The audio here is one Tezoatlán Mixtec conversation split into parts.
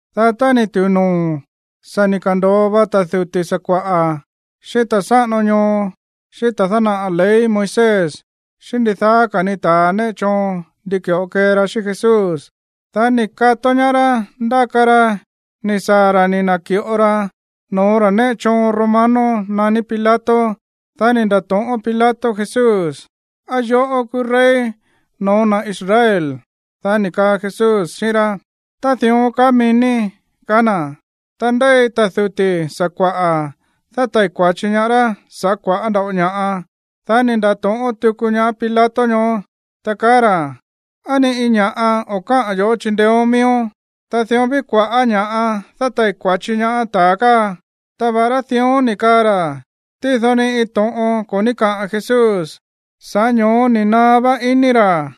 Dá tá ni̱ tu̱u noo̱, sa̱ ni̱ ka̱ndo̱o va ta̱ duti̱ sakua̱ꞌa̱, xíꞌín ta̱ sáꞌano ñoo, xíꞌín ta̱a dánaꞌa̱ ley Moisés xíꞌín ndidaá ka̱ ní ta̱ néꞌe choon ndi ki̱ꞌo kee ra xíꞌín Jesús. Dá ni̱ kató ñaá rá ndáka ra ni̱ saa̱ ra̱ ni̱ na̱ki̱ꞌo ra no̱ó ta̱ néꞌe choon romano naní Pilato. Dá ni̱ nda̱to̱ꞌón Pilato Jesús: ―¿Á yoꞌó kúú rey no̱ó na̱ Israel? Dá ni̱ kaa Jesús xíꞌín rá: ―Tá dión kaá mií ní ―kaá na̱. Ta ndéi ta̱ duti̱ sakua̱ꞌa̱ dátai̱ kua̱chi ñaá rá sa̱ꞌá kua̱ꞌá nda̱ꞌo ña̱ꞌa. Dá ni̱ nda̱to̱ꞌón tuku ñaá Pilato ñoó, ta kaá ra̱: ―¿Á ni iin ña̱ꞌa o̱ káꞌa̱n yo̱ꞌó chindeéón miíón? Ta dión ví kua̱ꞌá ña̱ꞌa dátai̱ kua̱chi ñaá ta̱a káa. Ta va̱ꞌará dión ni̱ kaa ra̱, tído ni iin to̱ꞌon ko̱ ní kaꞌa̱n Jesús. Sa̱ꞌá ño̱ó ni̱ naá vá iní ra̱.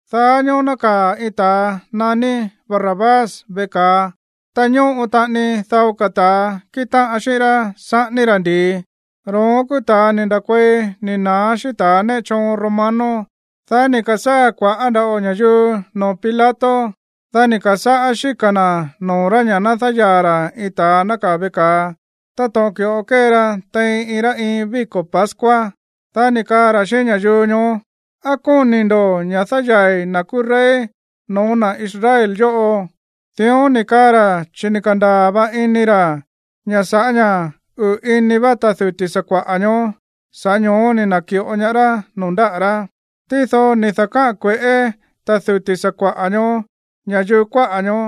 Daá ñóó nákaa̱ iin ta̱a naní Barrabás veꞌe ka̱a, ta ñóꞌo taꞌani dao ka̱ ta̱a kíꞌin táꞌan xíꞌín rá saꞌání rá ndi̱i. Ro̱ón kúú ta̱a ni̱ nda̱kuei ni̱ na̱á xíꞌín ta̱ néꞌe choon romano. Dá ni̱ ka̱sáa̱ kua̱ꞌá nda̱ꞌo ña̱yuu noo̱ Pilato. Dá ni̱ ka̱sáꞌá xíka̱ na̱ noo̱ rá ña̱ ná dáyaa̱ ra̱ iin ta̱a nákaa̱ veꞌe ka̱a, táto̱ꞌon ki̱ꞌo kée ra tein iin rá iin víko̱ pascua. Dá ni̱ kaa ra̱ xíꞌín ña̱yuu ñoó: ―¿Á kóni̱ ndo̱ ña̱ dáyaa̱i̱ na̱ kúú rey no̱ó na̱ Israel yóꞌo? Dión ni̱ kaa ra̱ chi̱ ni̱ ka̱ndaa̱ va ini ra̱ ña̱ sa̱ꞌá ña̱ uꞌu̱ ini vá ta̱ duti̱ sakua̱ꞌa̱ ñoó, sa̱ꞌá ño̱ó ni̱ na̱ki̱ꞌo ñaá rá noo̱ ndáꞌa̱ rá. Tído ni̱ da̱káꞌa̱n kue̱ꞌé ta̱ duti̱ sakua̱ꞌa̱ ñoó ña̱yuu kuáꞌa̱ ñoó,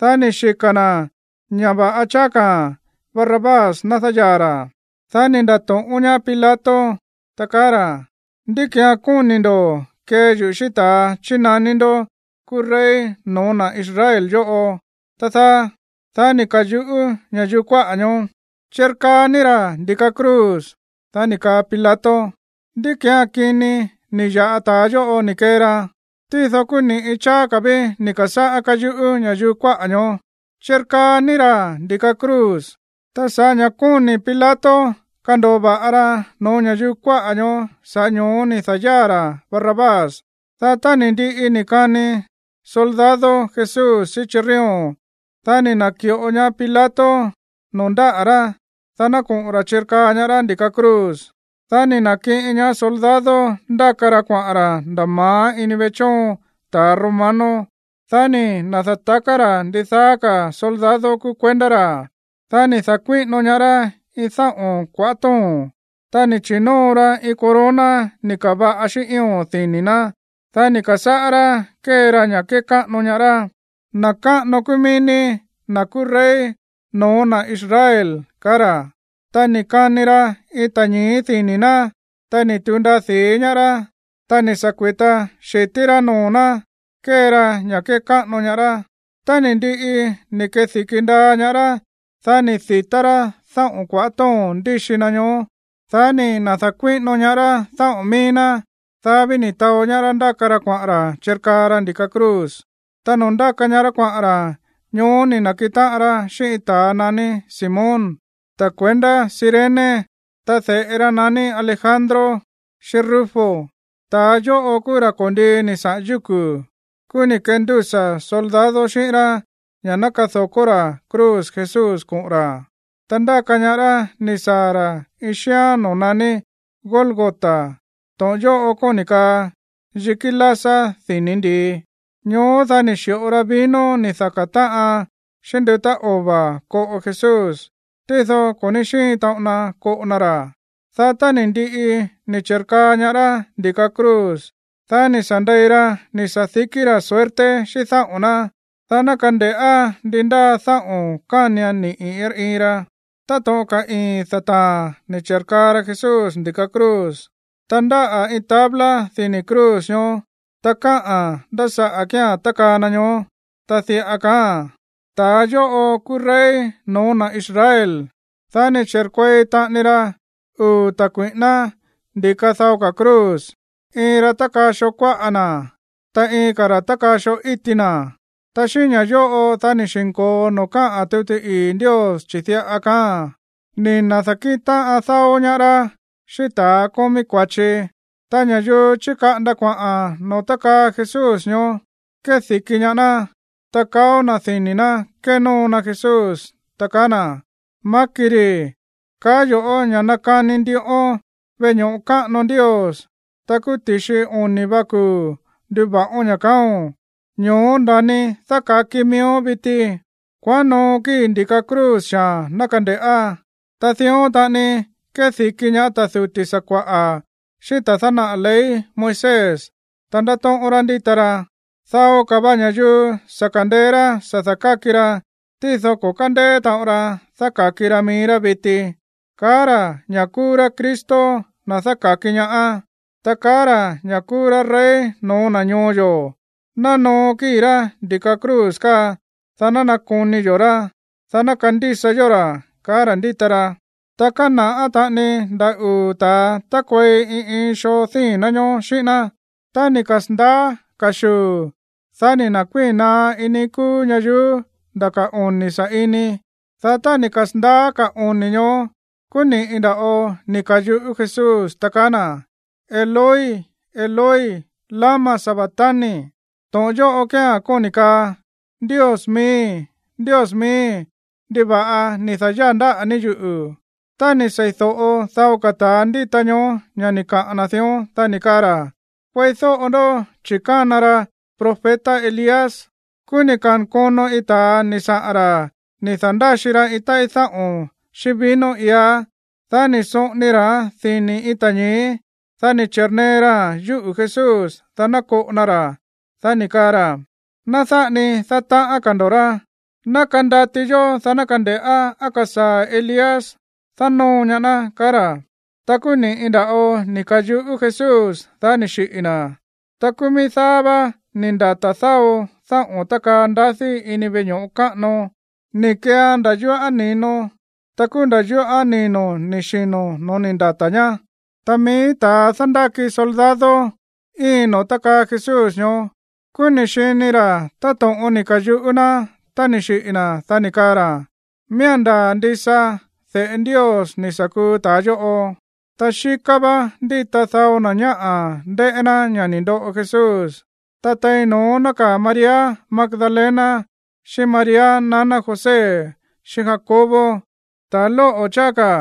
dá ni̱ xika̱ na̱ ña̱ va̱ꞌa cháá ka̱ Barrabás ná dáyaa̱ ra̱. Dá ni̱ nda̱to̱ꞌón ñaá Pilato, ta kaá ra̱: ―¿Ndí ki̱án kóni̱ ndo̱ kee yuꞌu̱ xíꞌín ta̱a chínaní ndó kúú rey no̱ó na̱ Israel yóꞌo, tá dáá? Dá ni̱ ka̱yuꞌú ña̱yuu kuáꞌa̱ ñoó: ―¡Chirkaa ní ra̱ ndi̱ka cruz! Dá ni̱ kaa Pilato: ―¿Ndí ki̱án kini ni̱ ya̱ꞌa ta̱a yóꞌo ni̱ kee ra? Tído kúú ni̱ꞌi cháá ka̱ ví ni̱ ka̱sáꞌá káyuꞌú ña̱yuu kuáꞌa̱ ñoó: ―¡Chirkaa ní ra̱ ndi̱ka cruz! Ta sa̱ꞌá ña̱ kóni̱ Pilato kando̱o va̱ꞌa ra no̱ó ña̱yuu kuáꞌa̱ ñoó, sa̱ꞌá ño̱ó ni̱ da̱yáa̱ ra̱ Barrabás. Dá tá ni̱ ndiꞌi ni̱ kani soldado Jesús xíꞌín chirrión, dá ni̱ na̱ki̱ꞌo ñaá Pilato noo̱ ndáꞌa̱ rá, dá ná koꞌo̱n ra̱ chirkaa ñaá rá ndi̱ka cruz. Dá ni̱ na̱kiꞌin ñaá soldado ndáka ra kuaꞌa̱n ra̱ nda̱ ma̱á ini veꞌe chóon ta̱ romano. Dá ni̱ na̱da̱taká ra̱ ndidaá ka̱ soldado kúú kuendá ra̱. Dá ni̱ da̱kuíꞌino ñaá rá iin dáꞌo̱n kuaꞌá to̱ón, ta ni̱ chi̱nóo ra iin corona ni̱ ka̱va̱ꞌa xíꞌín ío̱n dini̱ ná. Dá ni̱ ka̱sáꞌá rá kée ra ña̱ kékáꞌano ñaá rá: ―Na̱ káꞌano kúú mií ní, na̱ kúú rey no̱ó na̱ Israel ―ka̱á ra̱. Ta ni̱ kani ra iin ta̱ñi̱í dini̱ ná, ta ni̱ tu̱u ndaa di̱í ñaá rá. Ta ni̱ sa̱ kui̱ta xi̱tí rá noo̱ ná kée ra ña̱ kékáꞌano ñaá rá. Tá ni̱ ndiꞌi ni̱ kedi̱ki ndaa ñaá rá, dá ni̱ di̱tá rá dáꞌo̱n kuaꞌá to̱ón ndíxi na ñoó. Dá ni̱ na̱da̱kuíꞌino ñaá rá dáꞌo̱n míí ná. Dá ví ni̱ taó ñaá rá ndáka ra kuaꞌa̱n ra̱ chirkaa ra ndi̱ka cruz. Ta noo̱ ndáka ñaá rá kuaꞌa̱n ra̱, ñoó ni̱ na̱kiꞌin táꞌan ra xíꞌín iin ta̱a naní Simón, ta̱ kuendá Cirene. Ta de̱ꞌe ra naní Alejandro xíꞌín Rufo. Ta̱ yóꞌo kúú ra̱ ko̱ndii ni̱ saꞌa̱n yúku̱. Kúú ni̱ kendúsa̱ soldado xíꞌín rá ña̱ ná kado̱kó ra̱ cruz Jesús koꞌo̱n ra̱. Ta ndáka ñaá rá ni̱ saa̱ ra̱ iin xíán noo̱ naní Gólgota. To̱ꞌon yóꞌo kóni̱ kaa yikí lásá dini̱ ndi̱i. Ñoó, dá ni̱ xi̱ꞌo ra vino ni̱ da̱taká táꞌan xíꞌín ndutá ova̱ koꞌo Jesús, tído ko̱ ní xíin taꞌon na koꞌo na ra̱. Dá tá ni̱ ndiꞌi ni̱ chi̱rkaa ñaá rá ndi̱ka cruz, dá ni̱ sa̱ ndei ra ni̱ sa̱dikí ra̱ suerte xíꞌín dáꞌo̱n ná, dá ná kande̱ꞌá ndi ndáa dáꞌo̱n kánian niꞌi̱ iin rá iin ra. Táto̱ꞌon ka̱ ii̱n dataa̱n ni̱ chi̱rkaa ra Jesús ndi̱ka cruz. Ta ndáꞌa̱ iin tabla dini̱ cruz ñoó, ta káꞌa̱n ndá saꞌa̱ kía̱n tákaa na ñoó. Ta diꞌa kaáa̱n: “Ta̱a yóꞌo kúú rey no̱ó na̱ Israel.” Dá ni̱ chi̱rkuei taꞌani ra uu̱ ta̱ kui̱ꞌíná ndi̱ka dao ka̱ cruz. Iin ra tákaa xoo kuáꞌa na̱, ta iin ka̱ ra̱ tákaa xoo íti na̱. Ta xíꞌín ña̱ yóꞌo dá ni̱ xi̱nko̱o noo̱ káꞌa̱n tuti ii̱ Ndios, chi̱ diꞌa kaáa̱n: “Ni̱ na̱da̱kíꞌin táꞌan dáó ñaá rá xíꞌín ta̱ kómí kua̱chi.” Ta ña̱yuu chíkaꞌanda kuaꞌa̱n noo̱ tákaa Jesús ñoó kédi̱ki ñaá ná, ta kaó na̱ dini̱ ná kénóo na Jesús, ta kaá na̱: ―¡Maáki̱ ri̱! Kaá yo̱ꞌó ña̱ nakani ndiꞌón veꞌe ño̱ꞌo káꞌano Ndios. Ta kúú ti̱xi oni̱ va kuu̱ nduva̱ꞌón ña̱, kaáo̱n. Ño̱ó nda̱ni, dáka̱ki miíón viti. Kuaꞌán noo kíi̱ ndi̱ka cruz xaa̱n ná kande̱ꞌá. Ta dión taꞌani kédi̱ki ñaá ta̱ duti̱ sakua̱ꞌa̱ xíꞌín ta̱a dánaꞌa̱ ley Moisés, ta ndátóꞌón rá ndíta rá: ―Dao ka̱ va ña̱yuu sa̱ ka̱ndeé rá sa̱ da̱káki ra, tído ko̱ kándeé taꞌon ra dáka̱ki ra mií rá viti. ¡Kaá ra̱ ña̱ kúú rá Cristo, na̱ dáka̱ki ñaá! ¡Ta kaá ra̱ ña̱ kúú rá rey no̱ó na̱ ñoo yo̱! ¡Ná noo kíi̱ rá ndi̱ka cruz káa, dá ná nakoni yo̱ rá, dá ná kandísa yó ra̱! ―ka̱á ra̱ ndíta ra. Ta kána̱ꞌá taꞌani nda̱ uu̱ ta̱a tákuei iin iin xoo díi̱n ná ñóó xíꞌín ná. Tá ni̱ kasa̱ndaá ka̱xuu̱, dá ni̱ na̱kuíi̱n naá iin níí kúú ñayuú nda̱ ka̱ oni̱ sa̱ꞌini. Dá tá ni̱ kasa̱ndaá ka̱ oni̱ ñoó, kúú ni̱ꞌi nda̱ꞌo ni̱ ka̱yuꞌú Jesús, ta kaá na̱: ―Eloi, Eloi, ¿lama sabactani? ―To̱ꞌon yóꞌo kía̱n kóni̱ kaa: Ndios miíi̱, Ndios miíi̱, ¿ndiva̱ꞌa ni̱ da̱yáa̱ ndáꞌa̱ ní yuꞌu̱? Tá ni̱ sei̱do̱ꞌo dao ka̱ ta̱a ndíta ñoó ña̱ ni̱ kaꞌa̱n na̱ dión, dá ni̱ kaa ra̱: ―Kueídóꞌo ndó, chi̱ kána ra profeta Elías. Kúú ni̱ ka̱nkono iin ta̱a ni̱ saꞌa̱n ra̱ ni̱ da̱ndáxi ra iin táꞌí dáꞌo̱n xíꞌín vino iá. Dá ni̱ soꞌoni ra̱án dini̱ iin ta̱ñi̱í. Dá ni̱ chi̱rnee raa̱n yúꞌu̱ Jesús, dá ná koꞌo na ra̱. Dá ni̱ kaa ra̱: ―Ná dáꞌa ni kee ndo dión. Ná kandati yó, dá ná kande̱ꞌá á kasaa̱ Elías dánóo ñaá ná ―kaá ra̱. Ta kúú ni̱ꞌi nda̱ꞌo ni̱ ka̱yuꞌú Jesús, dá ni̱ xiꞌi̱ na̱. Ta kúú mií dáá vá ni̱ ndata̱ dao dáꞌo̱n tákaa ndadí ini veꞌe ño̱ꞌo káꞌano. Ni̱ keean nda̱ yúꞌa̱n ni̱no, ta kúú nda̱ yúꞌa̱n nino̱ ni̱ xino̱ no̱ó ni̱ ndata̱ ñá. Ta mií ta̱a dándáki soldado íin noo̱ tákaa Jesús ñoó. Kúú ni̱ xini ra̱ táto̱ꞌon ni̱ ka̱yuꞌú ná tá ni̱ xiꞌi̱ na̱, dá ni̱ kaa ra̱: ―¡Miía̱n ndaa̱ ndisa de̱ꞌe Ndios ni̱ sa̱ kuu ta̱a yóꞌo! Ta xíká vá ndíta dao na̱ ñáꞌa̱ ndéꞌé ná ña̱ ni̱ ndoꞌo Jesús. Ta tein no̱ón nákaa̱ María Magdalena, xíꞌín María naná José xíꞌín Jacobo, ta̱ lóꞌo̱ cháá ka̱.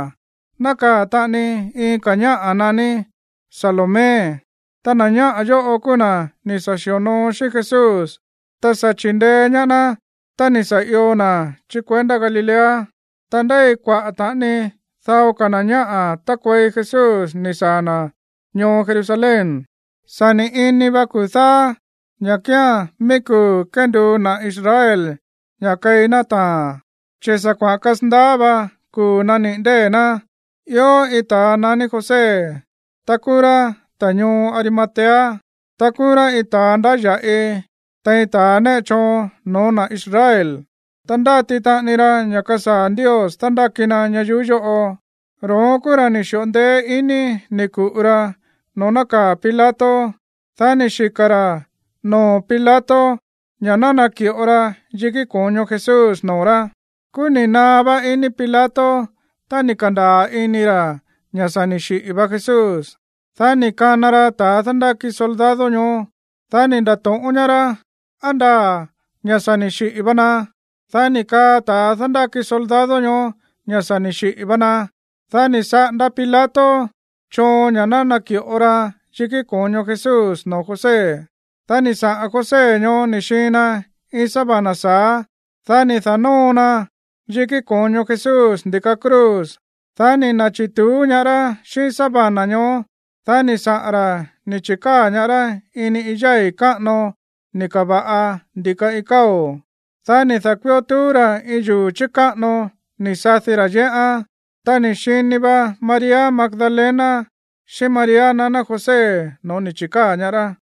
Nákaa̱ taꞌani iin ka̱ ñáꞌa̱ naní Salomé. Ta na̱ ñáꞌa̱ yóꞌo kúú na̱ ni̱ sa̱ xi̱onoo xíꞌín Jesús, ta sa̱ chi̱ndeé ñaá ná tá ni̱ sa̱ io na̱ chí kuendá Galilea. Ta ndéi kuaꞌa̱ taꞌani dao ka̱ na̱ ñáꞌa̱ tákuei Jesús ni̱ saa̱ na̱ ñoo Jerusalén. Sa̱ ni̱ ini va kuu̱ dáá, ña̱ kía̱n mií kuu̱ kénduu na̱ Israel ña̱ꞌa keí ná taa̱n, chi̱ sa̱ kuaꞌa̱n kasandaá va kuu̱ nániꞌi̱ ndée̱ ná. Ió iin ta̱a naní José, ta kúú rá ta̱ ñoo Arimatea. Ta kúú rá iin ta̱a ndáya̱ꞌi tein ta̱ néꞌe choon no̱ó na̱ Israel. Ta ndáti taꞌani ra ña̱ kasaa̱ Ndios dándáki na ñayuú yóꞌo. Ro̱ón kúú ra̱ ni̱ xi̱ꞌo ndeé iní ni̱ ku̱ꞌu ra noo̱ nákaa̱ Pilato. Dá ni̱ xika̱ ra̱ noo̱ Pilato ña̱ ná naki̱ꞌo ra yikí ko̱ño Jesús noo̱ rá. Kúú ni̱ naá vá iní Pilato tá ni̱ ka̱ndaa̱ ini ra̱ ña̱ sa̱ ni̱ xiꞌi̱ va Jesús. Dá ni̱ kana ra ta̱ dándáki soldado ñoó. Dá ni̱ nda̱to̱ꞌón ñaá rá, á ndaa̱ ña̱ sa̱ ni̱ xiꞌi̱ va na. Dá ni̱ kaa ta̱ dándáki soldado ñoó ña̱ sa̱ ni̱ xiꞌi̱ va na. Dá ni̱ saꞌanda Pilato choon ña̱ ná naki̱ꞌo ra yikí ko̱ño Jesús noo̱ José. Dá ni̱ saꞌa̱n José ñoó ni̱ xiin na iin sábana sa̱á. Dá ni̱ da̱nóo ra yikí ko̱ño Jesús ndi̱ka cruz. Dá ni̱ na̱chi̱tuú ñaá rá xíꞌín sábana ñoó. Dá ni̱ saꞌa̱n ra̱ ni̱ chi̱káa̱ ñaá rá ini iin yái̱ káꞌano ni̱ ka̱va̱ꞌa ndi̱ka iin káo̱. Dá ni̱ da̱kui̱ó tuú ra̱ iin yuu̱ chi̱káꞌano ni̱ sadi ra̱ yéꞌán. Ta ni̱ xini va María Magdalena xíꞌín María naná José no̱ó ni̱ chi̱káa̱ ñaá rá.